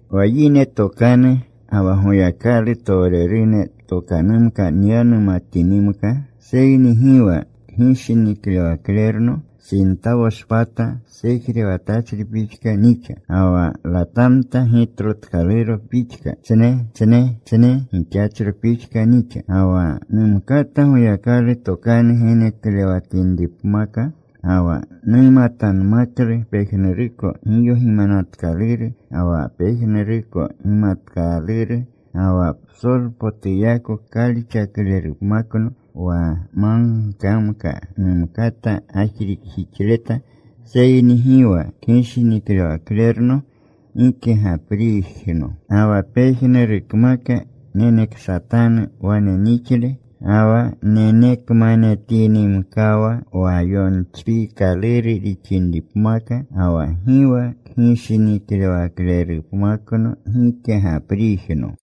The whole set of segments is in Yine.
Wa yine tokanu ga wa Goyakalutowrene tokanumka nyanumatinimka seyni gi wa kgishiniklewaklerno, sintawoshpata sejrewatachri pixka nixa, ga wa latamta gitlotkaluro pixka, tsne tsne tsne gixachro pixka nixa. Ga wa numkata Goyakalu tokanu geneklewatinripmaka, ga wa numatanmaklu pejnuruko giyogimanatkaluru ga wa pejnuruko gimatkaluru, ga wa psolpotuyako kalixaklerupmakno, wa magkamka numkata gajrikjixleta seyni gi wa kgishiniklewaklerno, gike gapriijno. Ga wa pejnurukmaka neneksatanu wane nixle, ga wa nenekmanetinimkawa wa yochpiikaluru rixinripmaka, ga wa gi wa kgishiniklewaklerupmakno, gike gapriijno.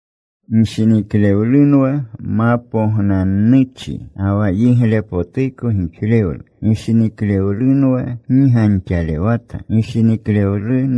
Gishiniklewlunwa ma pognanuchni ga wa yiglepotuko gixlewlu. Gishiniklewlunwa gi ganxalewata. Gishiniklewlu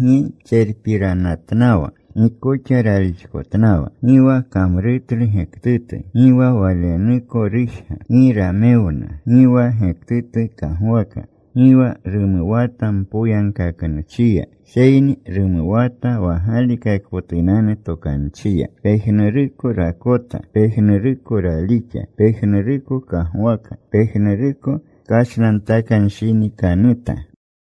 gi tserpiranatnawa, gi koxa ralixkotnawa. Gi wa kamrutlu gektutu. Gi wa walenuko rujga. Gi ramewna. Gi wa gektutu kagwaka. Gi wa rumuwata mpoyagkaknuchiya, seyni rumuwata wa galikakpotunanu tokanchiya. Pejnuruko rakota. Pejnuruko ralixa. Pejnuruko kagwaka. Pejnuruko kashnantakanshinikanuta.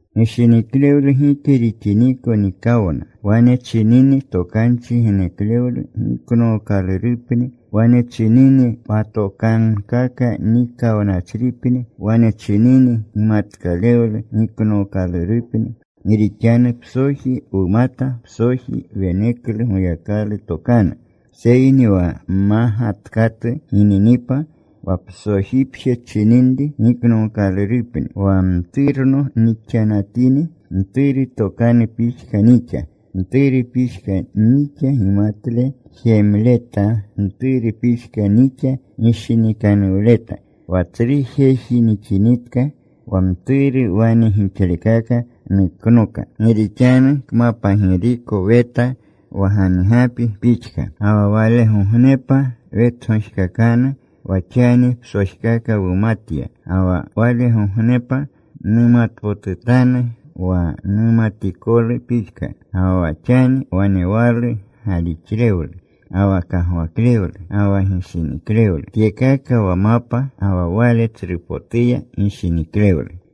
Gishiniklewlu gike rixiniko nikawna. Wane chinini tokanchi geneklewlu, giknookalurupni. Wane chinini patokankaka, nikawnachripni. Wane chinini gimatkalewlu, giknookalurupni. Gi rixanu psoji wumata, psoji weneklu Goyakalu tokanu. Seyni wa mmagatkatu gininipa, wa psojipje chininri giknookalurupni. Wa mturno nixanatini, mturu tokanu pixka nixa, mturu pixka nixa gimatle jemleta. Mturu pixka nixa gishinikanuwleta. Wa tsru jeji nixinitka, wa mturu wane gixlekaka nuknoka. Gi rixanu kmapagiriko weta wa ganigapi pixka. Ga wa walegognepa wetgojkakanu. Wa xani psojkaka numatya, ga wa walegognepa numatpotutanu wa numatikoluko pixka. Ga wa xani wanewalu galixlewlu, ga wa kagwaklewlu, ga wa gishiniklewlu. Tyekaka wa mapa. Ga wa wale tsrupotuya gishiniklewlu.